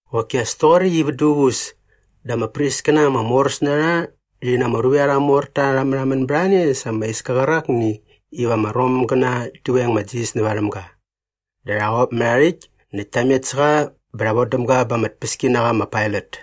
Qoki as toqoräkt i vät duququs dä ama priskäna ama moräs na rha rhi na ama ruvek arha morta rha märhamän bät a ne sa ama iska qärakni iva ama Romgäna rhi veng ma Jisas nä varhäm ga. Dä rha qop mät aa rhäkt näkt ta met sä qa bä rha vodäm ga ba ama tpäskinaqa ma Pailat.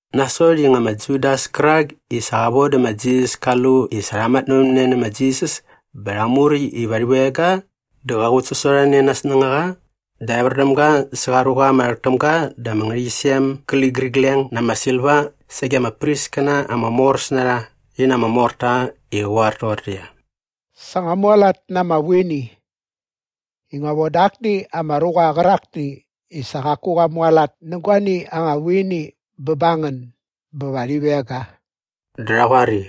Nasot i nga ma Judas kärak i sa qa vodä ma Jisas ka lu i sa rha matnävämne nä ma Jisas bä rha muräkt iva rhi veng ga dä qa qutsasorhane na aa snängaqa dä evär däm ga sa qa ruqa ama rhäk täm ga da ama ngärhäqyisem gä ligärigleng na ama silva sage ama priskäna ama moräs na rha rhi na ama morta i qä qoar toqortäqyia, “Sa ngua mualat na ama vuini. Ngua voda akni ama ruqa qärakni i sa qaku qa mualat nä guani anga vuini bä ba ngän bä va rhi veng ga.” Dä rha qoar i,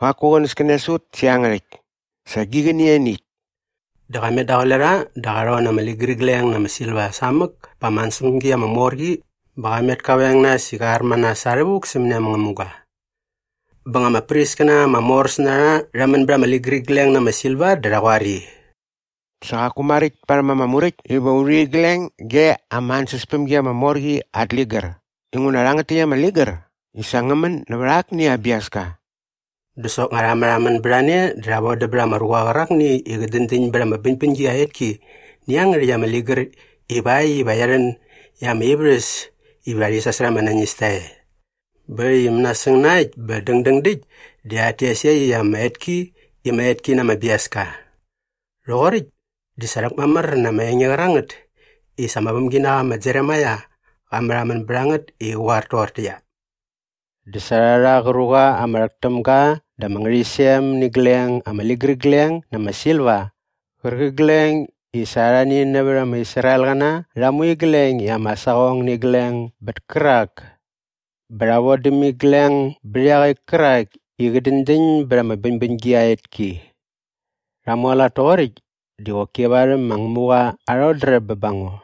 “Qaku qänäskänes ut sä iangärhäkt. Sa gi qäni ianiäkt.” Dä qa met daqule rha dä qa rhon na ama ligärigleng na ama silva samäk pa ama ansäspämgi ama mor qi bä qa met ka veng nas i qa ar ma nas sa rhävuk sämäni ama ngämuga. Bä nga ama priskäna ama moräs na rha rha män bät ama ligärigleng na ama silva dä rha qoar i, “Sa qaku maräkt parhäm ama Muräkt iva u rhu igleng ge ama ansäspämgi ama mor qi at ligär inguna rhangät täkt ama ligär di sa ngä män nävät akni aa biaska.” Dä soknga rha märhamän bät a ne dä rha vodäm bät ama ruqa qärakni i qä däñdäñ bät ama bäñbäñgi aa etki nä iangärhäkt ama ligär ivakt iva qia rhän i ama ivärhäs iva rhi sasärha ama nañista e. Bä äkt i mänasäng na äkt bä dängdäng däkt di rhat tes iaqyäkt ama etki i ma Etki na ama Biaska. Rhoqoräkt di sa rhäkmamär na ama enge qärangät i sa ama vämginaqa ma Jeremaia qa märhamän bät a ngät i qä qoar toqortäqyia, “Dä sa rha rha qä ruqa ama rhäk täm ga da ama ngärhäqyisem nä igleng ama ligärigleng na ama silva qärqigleng i sa arhani nävät ama Israelqäna rha mu igleng i ama saqong nä igleng bät kärak bä rha von däm igleng bät iaqäkt kärak i qä däñdäñ bät ama bäñbäñgi aa etki. Rha mualat toqoräkt di qoki varhäm ma Ngämuqa aa rhodräp bä ba ngo.”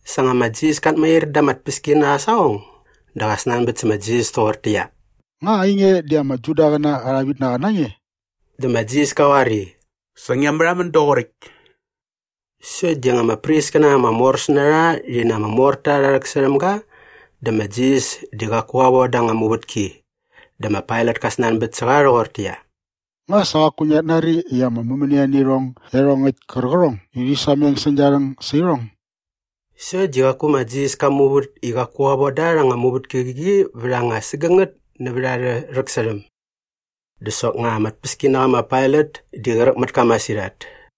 Sa nga ma Jisas kat mair da ama tpäskinaqa aa saqong dä qa snanbät sä ma Jisas toqortäqyia, “Nga ainge di ama Judaqäna arha vitnaqa na nge?” Dä ma Jisas ka qoar i, “Sa ngia märhamän doqoräkt.” Sokt di nga ama priskäna ama moräs na rha rhi na ama morta rha rhäksärhäm ga dä sa ma Jisas di qaku qa voda anga muvätki. Dä ma Pailat ka snanbät sä qa rhoqortäqyia, “Nga sa qaku ngiat nari i ama mämänia nä irhong iarhongäkt kärqärhong i rhi sameng säng gia rhäng sä irhong?” Sokt di qaku ma Jisas ka muvät i qaku qa von da rha anga muvätki käqi vät anga sägängät nävät arhä rhäksärhäm. Dä soknga ama tpäskinaqa ma Pailat di qräk mät ka masirhat.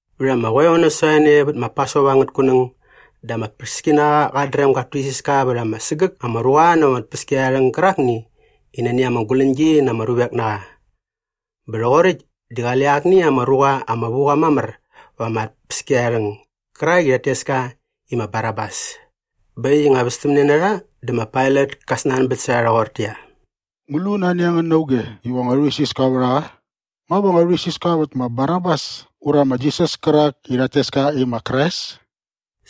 Vät ama qoeo nasot a ne vät ma Pasova angät kunäng dä ama tpäskinaqa qat dräm gat tuisiska vät ama sägäk ama ruqa näva ama tpäskiarharhäng gärakni i nani ama guläñgi na ama ruvek na qa. Bä rhoqoräkt di qale akni ama ruqa ama vu qa mamär va ama tpäskiarharhäng gärak i rhat tes ka i ma Barabas. Bä äkt i nga västämne na rha dä ma Pailat ka snanbät sä rha rhoqortäqyia, “Ngu lu nani a ngän na auge iva ngua rhuisiska vät a qa? Nga va ngua rhuisiska vät ma Barabas ura ma Jisas kärak i rhat tes ka i ma Krais?”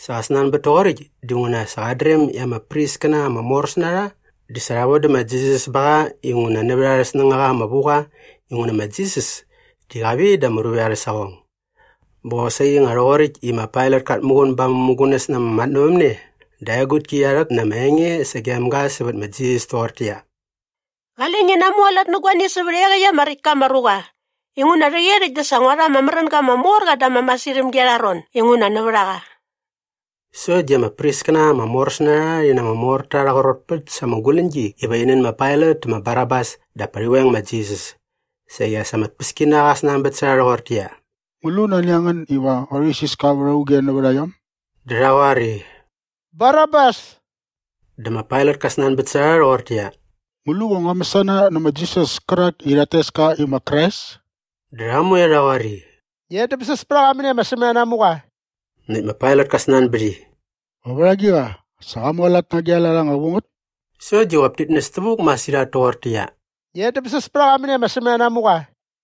Sa qa snanbät toqoräkt dinguna sa qat dräm i ama priskäna ama moräs na rha di sa rha vodä ma Jisas ba qa inguna nävät arhä snängaqa ama vu qa inguna ma Jisas di qa vit da ama ruvek arhä saqong. Bä qosaqi nga rhoqoräkt i ma Pailat kat muqun ba aa mämugunäs na ama matnävämne dä aa egutki qia rhäk na ama enge sagem ga sävät ma Jisas toqortäqyia, “Qale ngi namualat nä guani sävät iaqäkt ama räkt ka ama ruqa inguna rhäqyerhäkt dä sa ngua rha ama märänga ama mor qa da ama masirhämgi arha ron inguna nävät a qa.” Sokt di ama priskäna ama moräs na rha rhi na ama morta rha qrotpät sa ama guläñgi iva rhi nän ma Pailat tä ma Barabas dap pa qä veng ma Jisas. Saqi as ama tpäskinaqa qa snanbät sä rha rhoqortäqyia, “Ngu lu nani a ngän iva ngua rhuisiska vät auge nävät a iom?” Dä rha qoar i, “Barabas.” Dä ma Pailat ka snanbät sä rha rhoqortäqyia, “Ngu lu va ngua mäsana nä ma Jisas kärak i rhat tes ka i ma Krais?” Dä rha moe rha qoar i, “Ngi edämsäs pät a qa mäni ama sämänanamuqa!” Näkt ma Pailat ka snanbät i, “Va vät agiqa? Sa qa mualat na agi a lat anga vu ngät?” Sokt di qop tit näs tävuk masirhat toqortäqyia, “Ngi edämsäs pät a qa mäni ama sämänanamuqa!”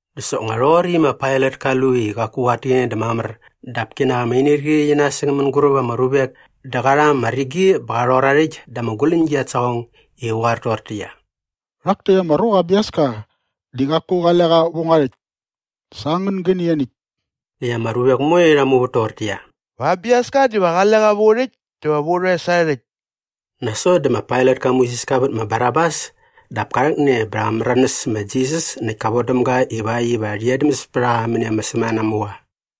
Dä soknga nga rhoqoräkt i ma Pailat ka lu i qaku qat täqäne dä mamär dap kinak ama inirqi qi nasäng mänguräp ama ruvek dä qa rha ama rigi bä qa rhor aa rhäkt da ama guläñgi at saqong i qä qoar toqortäqyia, “Rhak täkt ama ruqa aa biaska di qaku qale qa vä ngua rhäkt. Sa angän gäni ianiäkt.” Näkt ama ruvek moe rha muvät toqortäqyia, “Va aa biaska diva qale qa vä u rhäkt dä va au rhoes arhä rhäkt!” Nasot dä ma Pailat ka muisiska vät ma Barabas. Dap ka rhäkne bä rha märanäs ma Jisas näkt ka vodäm ga ivakt iva rhi edämsäs pät a qa mäni ama sämänanamuqa.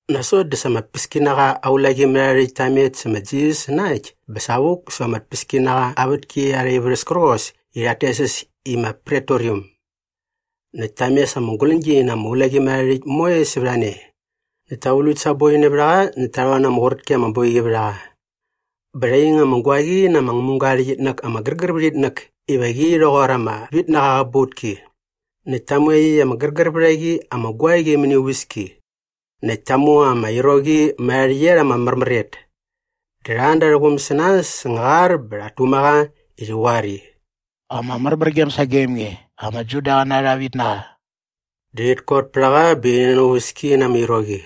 Nasot dä sa ama tpäskinaqa aa ulaqimärharhärhäkt ta met sä ma Jisas na äkt bä savuk säva ama tpäskinaqa aa vätki arha ivärhäs kärqos i rhat tes äs i ma Pretoriam. Näkt ta mes ama guläñgi na ama ulaqimärharhärhäkt moe sävät a ne. Näkt ta vlukt sa aa boi nävät a qa näkt ta rhon na ama qurät ki ama boiqi vät a qa. Bä rha ing ama guaqi na ama ngämuga aa rhäqyitnäk ama gärgär vät itnäk iva qi rhoqor ama vitnaqa aa qäbautki. Näkt ta mu iaqyäkt ama gärgär vät a qi ama guaqi mäni aa uväski. Näkt ta mu ama iroqi mät aa rhäqyet ama märmär et. Dä rha an da arhä quum sä nas säng aa qar bä rhat tuma qa i rhi qoar i, “Ama märmärgem sagem nge, ama Judaqäna arha vitnaqa!” Dä rhit kot pät a qa bä rhi nän aa uväski na ama iroqi.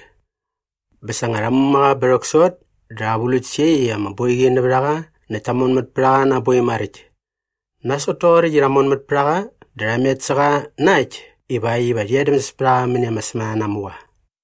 Bä sa nga rha muma qa bä rhäksot dä rha vlukt sa iaqyäkt ama boiqi nävät a qa näkt ta monmät pät a qa na aa boi maräkt. Nasot toqoräkt i rha monmät pät a qa dä rha met sä qa na äkt ivakt iva rhi edämsäs pät a qa mäni ama sämänanamuqa.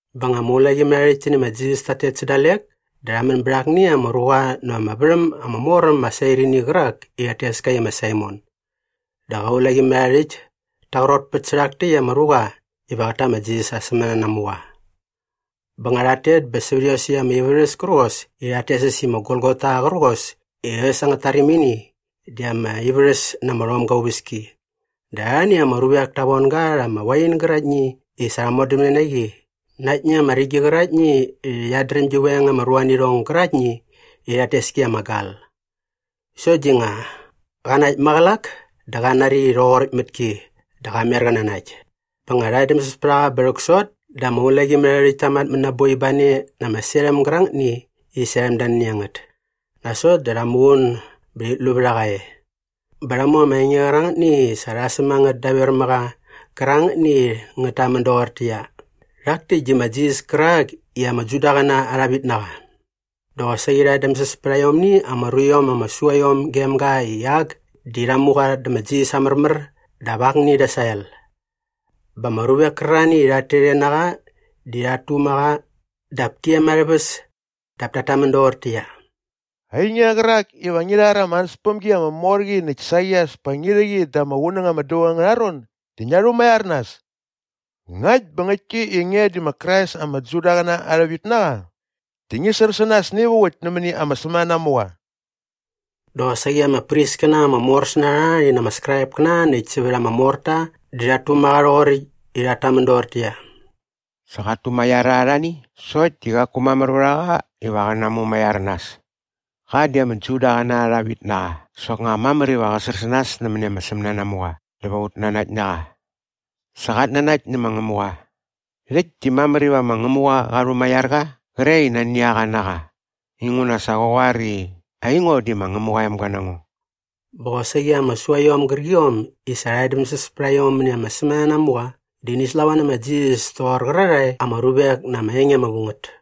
Bä nga ama ulaqimärharhärhäkt ti nä ma Jisas tat tet sä dalek dä rha män bät akni ama ruqa näva ama värhäm ama mor äm ma Sairini qärak i rhat tes ka i ma Saimon. Dä qa ulaqimärharhärhäkt ta qrotpät sä rhak täkt ama ruqa iva qät ta ma Jisas aa sämänanamuqa. Bä nga rhat tet bä sävät iosäkt ama ivärhäs kärqos i rhat tes äs i ma Golgota qärqos i äs angät tarimini di ama ivärhäs na ama rhomga aa uväski dä arhani ama ruvek ta von ga rha ama wain gäraktni i sa rha modämne na qi na aktni ama rigi qäraktni i qiat dräm gi veng ama ruanirhong gäraktni i rhat tes ki i ama gal. Sokt di nga qa nakt maqälak dä qa nari i rhoqoräkt mät ki dä qa mer qä nanakt. Bä nga rha edämsäs pät a qa bä rhäksot dä ama ulaqimärharhärhäkt ta matmät na aa boi ba ne na ama serhäm gärangätni i serhäm da nani a ngät. Nasot dä rha muqun bä rhit lu vät a qa e. Bä rha mu ama enge qärangätni i sa rha säm a ngät daver mä qa qärangätni i ngät tamän doqortäqyia “Rhak täkt di ma Jisas kärak i ama Judaqäna arha vitnaqa.” Dä qosaqi rha edämsäs pät aiomni ama ruiom ama sua iom gem ga i ak di rha mu qa dä ma Jisas aa märmär dap akni da aa sael. Bä ama ruvek kärarhani i rhat tet e na qa di rhat tuma qa dap ti em arhä väs dap tat tamän doqortäqyia, “Ainge qärak iva ngi rhar ama ansäspämgi ama mor qi näkt saqi as pa ngi rhä qi da ama qunäng ama dävaung angärha ron di ngia rhumaiar nas! Ngakt bä ngäktki i nge di ma Krais ama Judaqäna arha vitnaqa di ngi sär sä nas navuk nämäni ama sämänanamuqa.” Dä qosaqi ama priskäna ama moräs na rha rhi na ama Skraipkäna näkt sävät ama morta di rhat tuma qa rhoqoräkt i rhat tamän doqortäqyia, “Sa qat tumaiar arhani sokt di qaku mamär vät a qa iva qä namumaiar nas! Qa di ama Judaqäna arha vitnaqa dä soknga mamär iva qä sär sä nas nämäni ama sämänanamuqa dä va ut nanakt na qa. Sa qat nanakt nä ma Ngämuqa. Rhäkt di mamär iva ma Ngämuqa qa rhumaiar qa qre i nani a qa na qa. Inguna sa qa qoar i, ‘Aingo di ma Ngämuqa aa emga na ngo.’” Bä qosaqi ama suaiom gärqiom i sa rha edämsäs pät a iom mäni ama sämänanamuqa di ini slava nä ma Jisas toqor qärarhae ama ruvek na ama enge ama vu ngät.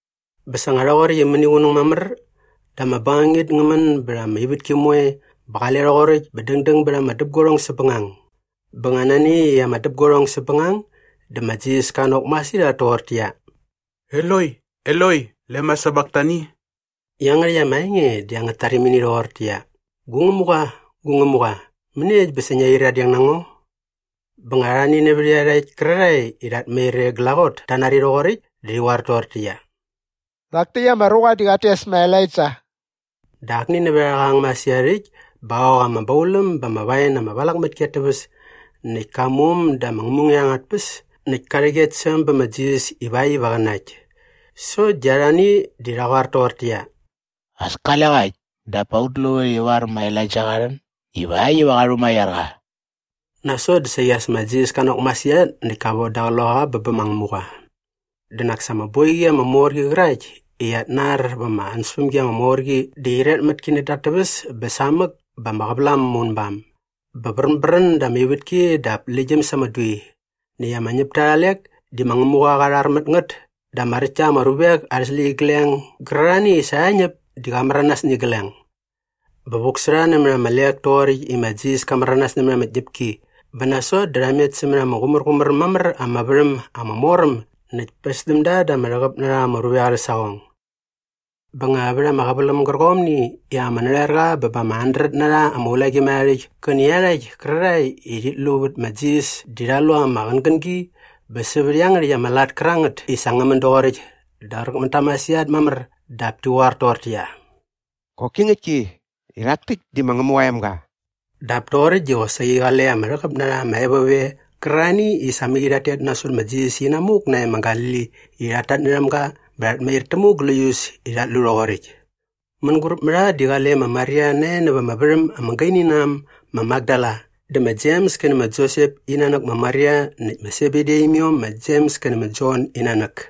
Bä sa nga rhoqoräkt i mäniqunäng mamär dä ama bängangit ngä män bät ama ivätki moe bä qale rhoqoräkt bä dängdäng bät ama däpguarhong säpbängang. Bä nga nani äkt i ama däpguarhong säpbängang dä ma Jisas ka nok masirhat toqortäqyia, “Eloi, Eloi, lema sabaktani?” Iangärhäkt ama enge di angät tarimini rhoqortäqyia, “Gu Ngämuqa, gu Ngämuqa, mäniekt bä sa ngia qyiradeng na ngo?” Bä nga arhani nävät iarhakt kärarhae i rhat mair e glaqot ta nari rhoqoräkt dä rhi qoar toqortäqyia, “Rhak täkt ama ruqa di qat tes ma Elaija.” Dä akni nävät a rha qa ang masirhat äkt bä qa ok ama bauläm ba ama wain ama valak mät ki at täväs näkt ka mu äm da ama ngämunget angät tpäs näkt ka rhäk et sä äm bä ma Jisas ivakt iva qä nakt. Sokt di arhani di rha qoar toqortäqyia, “As kale qa äkt dap pa ut luvät ivar ma Elaija qa rhän ivakt iva qä rhumaiar qa.” Nasot dä saqi as ma Jisas ka nok masirhat näkt ka voda aa qloqaqa bä bä ma Ngämuqa. Dä nak sa ama boiqi ama mor qi qärakt i qiat nar va ama ansäspämgi ama mor qi di qyiret mät ki nädä at täväs bä samäk bä ama qävälam ama unbam. Bä vränbrän da ama ivätki dap läktgyäm sa ama dui. Näkt ama ñäpta arha lek di ma Ngämuqa qa rhar mät ngät dä ama räkt ta ama ruvek arhä släqyigleng gärarhani i sa rha ñäp di qa märanas nä igleng. Bä vuk sä rha nämät arha lek toqoräkt i ma Jisas ka märanas nämät ama tñäpki bä nasot dä rha met sämät ama qumärqumär äm mamär ama värhäm ama mor äm näkt päs däm da da ama rhäqäp na rha ama ruvek arhä saqong. Bä nga vät ama qäväläm gärqomni i ama narhoerqa bä ba ama handret na rha ama ulaqimärharhärhäkt kä nä iarhakt kärarhae i rhit lu vät ma Jisas di rha lu ama qängängi bä sävät iangärhäkt ama lat kärangät i sa ngä män doqoräkt dä qräk mät ta masirhat mamär dap ti qoar toqortäqyia, “Qoki ngäktki i rhak täkt di ma Ngämuqa aa emga!” Dap toqoräkt di qosaqi qale ama rhäqäp na rha ama evop e qärarhani i sa mäqi rhat tet nasot ma Jisas inamuk nae ma Galili i rhat tatnärhäm ga bä rhat mair tämuk gläius i rhat lu rhoqoräkt. Mänguräp mä rha di qale ma Maria nae näva ama värhäm ama gaini na äm ma Makdala dä ma Jems kä nä ma Josep in nanäk ma Maria näkt ma Sebedi aa imiom ma Jems kä nä ma Jon in nanäk.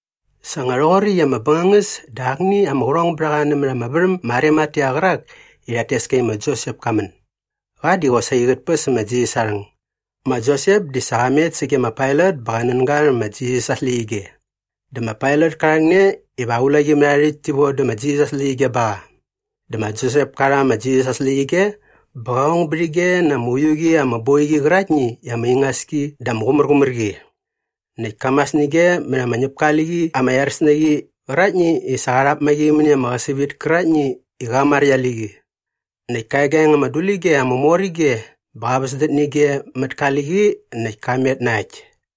Sa nga rhoqoräkt i ama bängangäs dä akni ama qärhongbärhaqa nämät ama värhäm ma Arimatea qärak i rhat tes ka i ma Josep ka män. Qa di qosaqi qät päs ma Jisas aa rhäng. Ma Josep di sa qa met sage ma Pailat bä qa nän ga rhä ma Jisas aa släqyige. Dä ma Pailat ka rhäkne iva aa ulaqimärharhärhäkt ti von dä ma Jisas aa släqyige ba qa. Dä ma Josep ka rha ma Jisas aa släqyige bä qa ong bät ige na ama uiu qi ama boiqi qäraktni i ama ingas ki dä ama qumärqumär qi. Näkt ka mas nä ige mät ama ñäpka aa liqi ama iaräs na qi qäraktni i sa qa rhap ma qi mäni ama qäsävit käraktni i qa maräkt aa liqi. Näkt ka egaeng ama dulige ama mor ige bä qa väsdät nä ige mät ka liqi näkt ka met na äkt.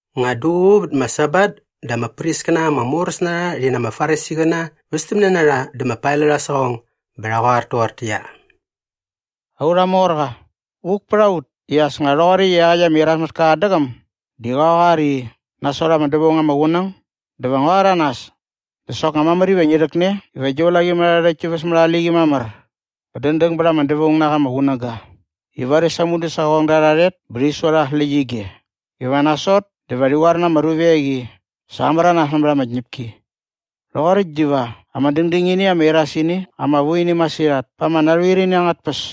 Nga duququ vät ma Sabat dä ama priskäna ama moräs na rha rhi na ama Farisiqäna västämne na rha dä ma Pailat aa saqong bä rha qoar toqortäqyia, “Aurha morqa, vuk pät a ut i as nga rhoqoräkt i iaqäkt ama irasmätka qat däqäm di qa qoar i, ‘Nasot ama dävaung ama qunäng dä va ngua rhäranas.’ Dä soknga mamär iva ngi rhäkne iva gi ulaqimärharhärhäkt ti väs mät aa liqi mamär bä dängdäng bät ama dävaung na qa ama qunäga i varis aa mudäsaqongda rha rhet bä rhi sua rha aa släqyige iva nasot dä va rhi qoar na ama ruvek i, ‘Sa qa märanas nämät ama tñäpki.’ Rhoqoräkt diva ama dängdängini ama irasini ama vu ini masirhat pa ama narhoer ini angät tpäs.”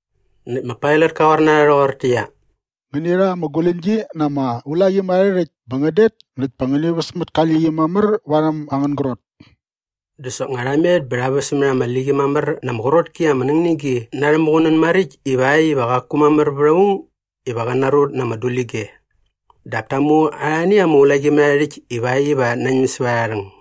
Näkt ma Pailat ka qoar na rha rhoqortäqyia, “Ngäni rha ama guläñgi na ama ulaqimärharhärhäkt bä ngän det näkt pa ngäni väs mät ka liqi mamär varhäm angän grot.” Dä soknga rha met bä rha väs mät ama liqi mamär na ama qrot ki ama ningnigi na arhä muqunän maräkt ivakt iva qaku mamär vät aung iva qä narut na ama dulige. Dap ta mu arhani ama ulaqimärharhärhäkt ivakt iva rhat nañäm säva arha rhäng.